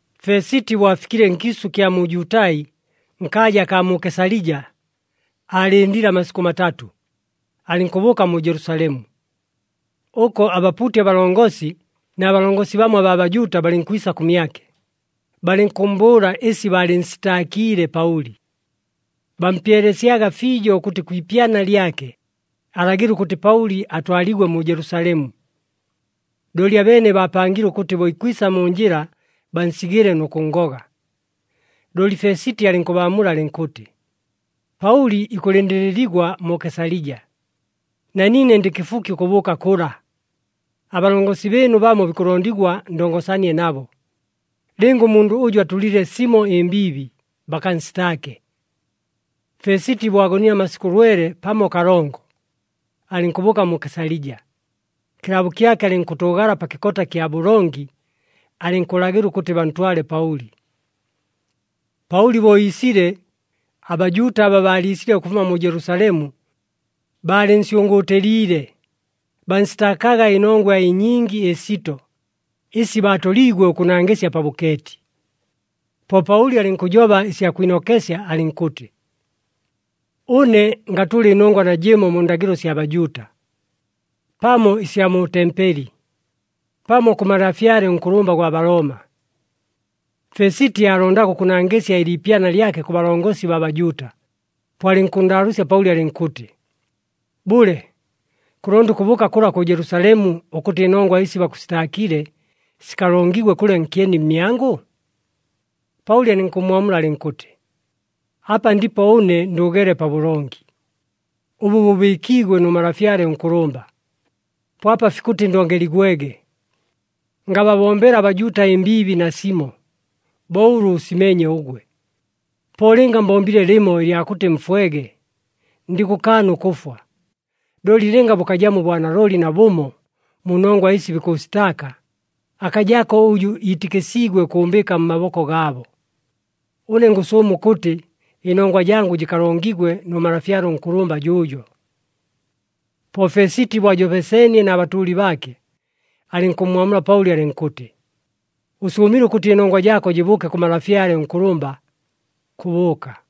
Fesiti bo afikile nkiisʉ ɨkya mu Jutai nkaaja akaa mu Kesalija, aalɨndile amasikʉ matatʉ, alɨnkʉbʉʉka mu Jelusalemu. Ʉko abapuuti abalongosi na balongosi bamo abaa Bajuuta balɨnkwisa kʉmyake, balɨnkʉmmbʉʉla ɨsi baalɨnsitaakiile Paʉli. Bampyelesyaga fiijo ʉkʉtɨ kwi ipyana lyake, alagɨle ʉkʉtɨ Paʉli atwaligwe mu Jelusalemu. Looli abeene baapangile ʉkʉtɨ bo ikwisa mu njɨla bansigɨle nʉ kʉnngoga. Looli Fesiti alɨnkʉbaamula alɨnkʉtɨ, “Paʉli ikʉlɨndɨlɨligwa mu Kesalija, na niine ndɨ kɨfuki ʉkʉbʉʉka kʉla. Abalongosi bɨɨnu bamo bikʉlondigwa ndongosanie nabo, lɨnga ʉmundʉ ʉjʉ atʉlile simo ɨmbiibi, bakansitaake.” Fesiti bo agonile amasikʉ lwele pamo kalongo, alɨnkʉbʉʉka mu Kesalija, kɨlaabo kyake alɨnkʉtʉʉgala pa kɨkota kya bʉlongi, alɨnkʉlagɨla ʉkʉtɨ bantwale Paʉli. Paʉli bo iisile, aBajuuta aba baaliisile ʉkʉfuma mu Jelusalemu, baalɨnsyʉngʉʉtɨliile, bansitaakaga ɨnongwa ɨnyingi ɨsito, ɨsi baatoliigwe ʉkʉnangɨsya pa bʉkeeti. Po Paʉli alɨnkʉjoba ɨsya kwinokesya alɨnkʉtɨ, “Ʉne ngatʉla ɨnongwa najɨmo mu ndagɨlo sya Bajuuta, pamo ɨsya mu tempeli, pamo kʉ malafyale ʉnkʉlʉmba gwa Balooma.” Fesiti aalondaga ʉkʉnangɨsya ɨliipyana lyake kʉ balongosi baa Bajuuta, po alɨnkʉnndaalʉʉsya Paʉli alɨnkʉtɨ, “Bʉle, kʉlonda ʉkʉbʉʉka kʉla kʉ Jelusalemu, ʉkʉtɨ ɨnongwa ɨsi bakʉsitaakile, sikalongigwe kʉla nkyeni mmyangʉ?” Paʉli alɨnkʉmmwamula alɨnkʉtɨ, “Apa ndipo ʉne ndʉʉgeele pabʉlongi, ʉbʉ bʉbɨɨkiigwe nʉ malafyale ʉnkʉlʉmba, po apa fikʉtɨ ndongeligwege. Ngababombela aBajuuta ɨmbiibi nasimo, bo ʉlʉ ʉsimeenye ʉgwe. Po lɨnga mbombile lɨmo ɨlya kʉtɨ mfwege, ndikʉkaana ʉkʉfwa, looli lɨnga bʉkajamo ʉbwanalooli nabʉmo mu nongwa ɨsi bikʉʉsitaaka, akajako ʉjʉ iitɨkɨsiigwe ʉkʉʉmbɨɨka mmaboko gaabo. Ʉne ngʉsʉʉma ʉkʉtɨ ɨnongwa jangʉ jɨkalongigwe nʉ malafyale ʉnkʉlʉmba jʉʉjo!” Po Fesiti bo ajobeseenie na batʉʉli baake, alɨnkʉmmwamula Paʉli alɨnkʉtɨ, “Ʉsʉʉmile ʉkʉtɨ ɨnongwa jaako jɨbʉʉke kʉ malafyale ʉnkʉlʉmba, kʉbʉʉka!”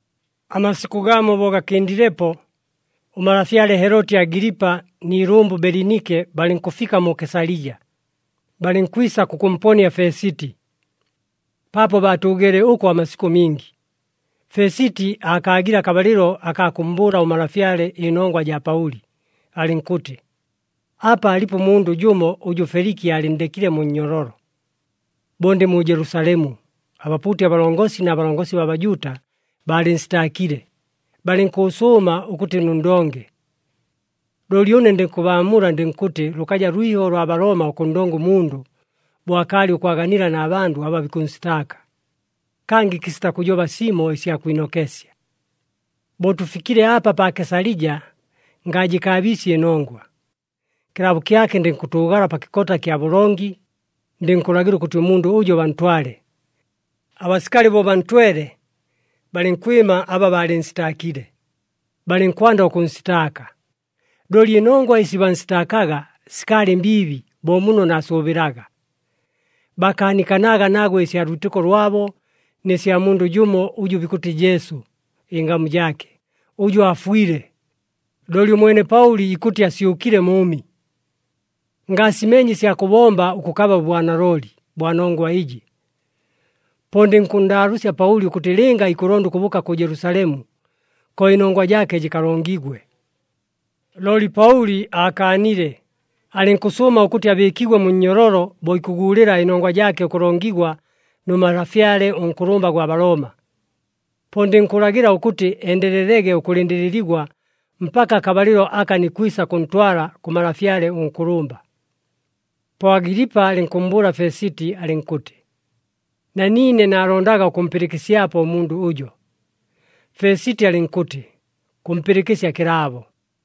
Amasikʉ gamo bo gakɨndilepo, ʉmalafyale Heloti Agilipa ni ilʉmbʉ Belinike balɨnkʉfika mu Kesalija, balɨnkwisa kʉkʉmponia Fesiti. Paapo baatʉʉgeele ʉko amasikʉ mingi, Fesiti aakaagile akabalɨlo akaa kʉmmbʉʉla ʉmalafyale ɨnongwa jaa Paʉli alɨnkʉtɨ, “Apa alipo ʉmundʉ jʉmo ʉjʉ Feliki aalɨnndekile mu nnyololo. Bo ndɨ mu Jelusalemu, abapuuti abalongosi na balongosi baa Bajuuta baalɨnsitaakile, balɨnkʉʉsʉʉma ʉkʉtɨ nʉnndonge. “Looli ʉne ndikʉbaamula, ndɨnkʉtɨ lʉkaja lwiho lwa Balooma ʉkʉnndonga ʉmundʉ, bo akaalɨ ʉkwaganila na bandʉ aba bikʉnsitaaka, kangɨ kɨsita kʉjoba simo ɨsya kwinokesya. Bo tʉfikile apa pa Kesalija, ngajɨkaabiisye ɨnongwa. Kɨlaabo kyake ndɨnkʉtʉʉgala pa kɨkota kya bʉlongi, ndɨnkʉlagɨla ʉkʉtɨ ʉmundʉ ʉjo bantwale. Abasikali bo bantwele, balɨnkwɨma aba baalɨnsitaakile, balɨnkwanda ʉkʉnsitaaka, looli ɨnongwa ɨsi bansitaakaga sikaalɨ mbiibi bo muno naasʉʉbɨlaga. Baakaanikanaga nagwe ɨsya lwitɨko lwabo, nɨ sya mundʉ jʉmo ʉjʉ bikʉtɨ Jesu ɨngamu jaake, ʉjʉ aafwile, looli ʉmwene Paʉli ikʉtɨ asyʉkile mʉʉmi. Ngaasimeenye ɨsya kʉbomba ʉkʉkaba ʉbwanalooli bwa nongwa ɨjɨ, po ndɨnkʉnndaalʉʉsya Paʉli ʉkʉtɨ lɨnga ikʉlonda ʉkʉbʉʉka kʉ Jelusalemu, ko ɨnongwa jaake jɨkalongigwe. Looli Paʉli aakaanile, alɨnkʉsʉʉma ʉkʉtɨ abɨɨkigwe mu nnyololo bo ikʉguulɨla ɨnongwa jaake ʉkʉlongigwa nʉ malafyale ʉnkʉlʉmba gwa Balooma. Po ndikʉlagɨla ʉkʉtɨ endelelege ʉkʉlɨndɨlɨligwa mpaka akabalɨlo aka nikwisa kʉntwala kʉ malafyale ʉnkʉlʉmba.” Po Agilipa alɨnkʉmmbʉʉla Fesiti alɨnkʉtɨ, “Na niine naalondaga ʉkʉmpɨlɨkɨsyapo ʉmundʉ ʉjo.” Fesiti alɨnkʉtɨ, “Kʉmpɨlɨkɨsya kɨlaabo.”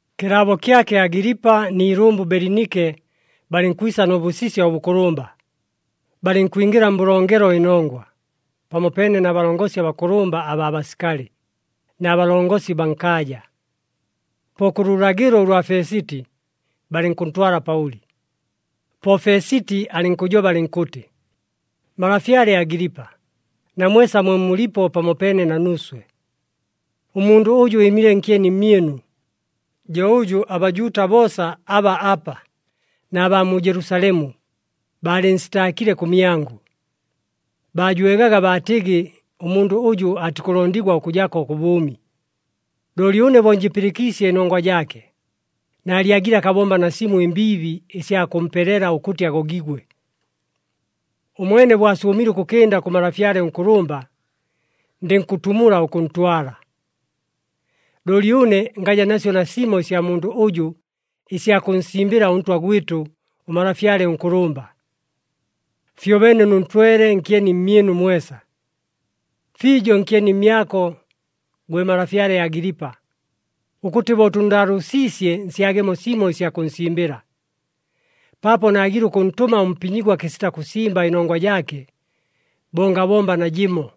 Kɨlaabo kyake Agilipa ni ilʉmbʉ Belinike balɨnkwisa nʉ bʉsisya ʉbʉkʉlʉmba, balɨnkwingɨla mbʉlongelo ɨnongwa, pamopeene na balongosi abakʉlʉmba abaa basikali, na balongosi baa nkaaja. Po kʉ lʉlagɨlo ʉlwa Fesiti, balɨnkʉntwala Paʉli. Po Fesiti alɨnkʉjoba alɨnkʉtɨ, “Malafyale Agilipa, na mwesa mwe mulipo pamopeene na nuuswe, ʉmundʉ ʉjʉ ɨɨmile nkyeni mmyɨnu, jo ʉjʉ aBajuuta boosa aba apa, na baa mu Jelusalemu, baalɨnsitaakile kʉmyangʉ. Baajwegaga baatɨgɨ ʉmundʉ ʉjʉ atikʉlondigwa ʉkʉjako kʉ bʉʉmi. Looli ʉne bo njɨpɨlɨkiisye ɨnongwa jaake, naalyagile akabomba nasimo ɨmbiibi ɨsya kʉmpelela ʉkʉtɨ agogigwe. Ʉmwene bo asʉʉmile ʉkʉkɨnda kʉ malafyale ʉnkʉlʉmba, ndɨnkʉtumula ʉkʉntwala. Looli ʉne ngaja nasyo nasimo ɨsya mundʉ ʉjʉ ɨsya kʉnsimbɨla ʉntwa gwɨtʉ ʉmalafyale ʉnkʉlʉmba. Fyobeene nʉntwele nkyeni mmyɨnu mwesa, fiijo nkyeni mmyako, gwe malafyale Agilipa, ʉkʉtɨ bo tʉnndaalʉʉsiisye nsyagemo simo ɨsya kʉnsimbɨla. Paapo naagile ʉkʉntʉma ʉmpinyigwa kɨsita kʉsimba ɨnongwa jaake, bo ngabomba najɨmo.”